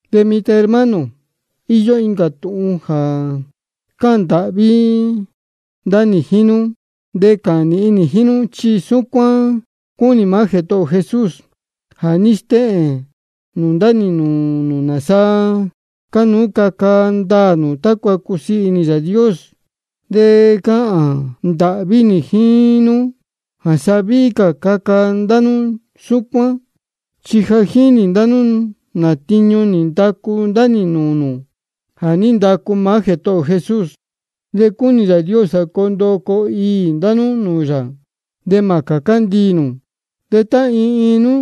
De mitan hermano, íyó incā tūhun jā cáhān ndāhví ndá nī jíín nú de cáhān nīhin nī jíín nú, chi súcuán cúnī maá Jētohō ō Jesús. Ja nī stéhēn ndá nī nūū nū nāsa cánuú caca ndaā nū tácua cusiī inī Yāā Dios. De cáhān ndāhví nī jíín nú jā sa víhí cā caca ndá nú súcuán. Chi ja jínī ndá nú nā tiñu nī ndacu ndá nī nūū nū jā ní ndacu maá Jētohō ō Jesús. De cúnī Yāā Dios jā coo ndoo coo iī ndá nú nūū yā, de mā cācá ndiī nū. De tá iin iin nú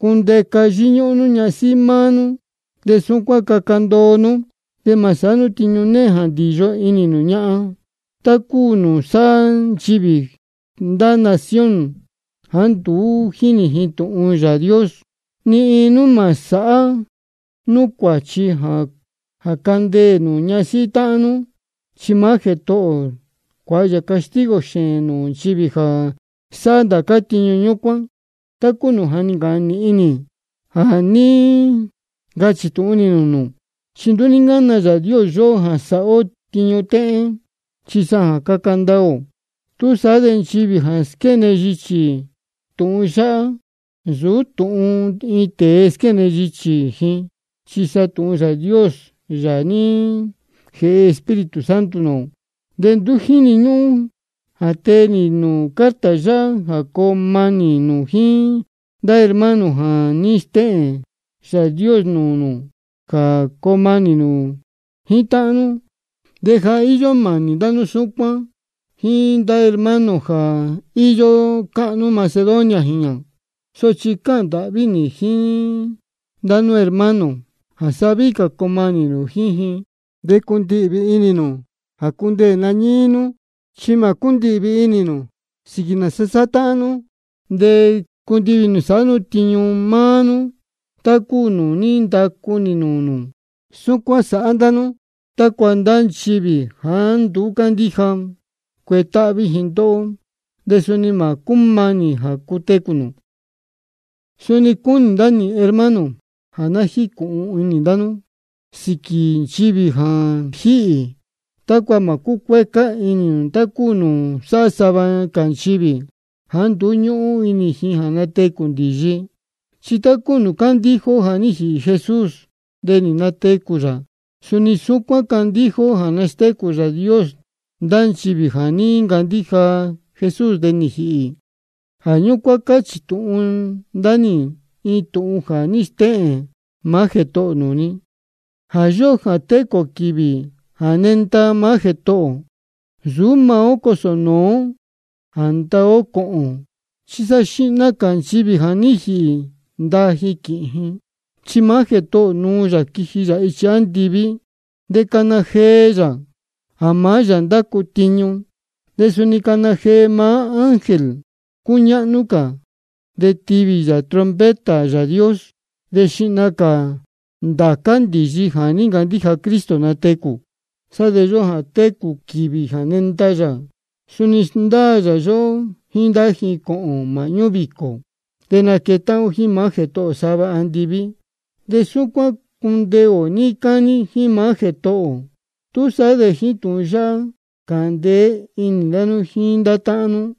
cundeca yíñúhún nú ñasíhí maá nú, de súcuán caca ndoo nú. De mā sāhá nú tiñu néhén jā ndīyo inī nū ñahan, tá cúu nūū sáhá nchivī ndá nación jāá nduú jínī ji tūhun Yāā Dios. Ni iin nú mā sāhá nú cuāchi jā candeē nū ñasíhí táhán nú. Chi maá Jētohō ō cuāha yā castigo xēēn nūū nchivī jā sáhá ndācá tiñu ñúcuán, tá cúu nūū ja nī ncāhān nīhin nī jā ní ncachī tūhun nī nūū nū. Chi nduú ní ncána Yāā Dios yóhó jā sāhá ó tiñu téhén, chi sa jā caca ndoo ó. Túsaá de nchivī jā squéne yichī tūhun yáhá, nsūú tūhun iin tēe squéne yichī ji, chi sa tūhun Yāā Dios, Yāā jā ní jēhe Espíritu Santo nūū ō. De nduú jíni ñúhún jā tee nī nūū carta yáhá jā coo manī nū jíín ndá hermano, chi ja nī stéhēn Yāā Dios nūū nū jā coo manī nū jíín táhán nú. De ja íyó mānī ndá nú súcuán jíín ndācá hermano jā íyó níí cáhnú Macedonia jīñā. Sochi cáhān ndāhví nī jíín ndá nú hermano, jā sa víhí cā coo manī nū jíín ji. De cundihvī inī nū jā cundeē nañíí nú, chi mā cúndihvī inī nū sīquī nāsa sáhá táhán nú, de cundihvī inī nū sāhá nú tiñu máá nú, tá cúu nūū ní ndacu ndá nī nūū nū. Súcuán sāhá ndá nú tácua ndá nchivī jāá nduú cándíja, cuetáhví ji ndóhó, de suni mā cúmanī jā cutecū nū. Suni cúnī ndá nī, hermano, jā ná jícūhun inī ndá nú sīquī nchivī jā jíhī, tácua mā cúcuécá inī nū tá cúu nūū sáhá sava cā nchivī jāá nduú ñúhún inī ji jā natecū ndīyi. Chi tá cúu nūū cándíja ó jā ní jīhī Jesús de nī natecū yā, suni súcuán cándíja ó jā nastécū Yāā Dios ndá nchivī jā ní ncandíja nūū Jesús de nī jīhī. Jā ñúcuán cáchī tūhun ndá nī iin tūhun jā ní stéhēn maá Jētohō ō nūū ni: Jā yóhó jā técū cā quīvī jā nenda maá Jētohō ō, nsūú maá ó cosō nūú ó jā ndaa ó cōhōn. Chi xihna cā nchivī ja nī jīhī ndaa ji quīhīn ji. Chi maá Jētohō ō nuu yā quiji yā ichi andiví, de cana jee yā jā maá yā ndácu tiñu, de suni cana jee maá ángel cúñáhnú cā, de tivī trompeta Yāā Dios. De xihna cā ndācá ndīyi jā ní ncandíja Cristo natecū. De sá de yóhó jā técū cā ō quīvī jā nenda yā, suni sndáa yā yóhó jíín ndá ji, cōhōn māhñú vīcō. De naquetáhán ó jíín maá Jētohō ō sava andiví. De súcuán cundeē ō níí cání jíín maá Jētohō ō. Túsaá de jíín tūhun yáhá cāhān ndeé inī ndá nú jíín ndá táhán nú.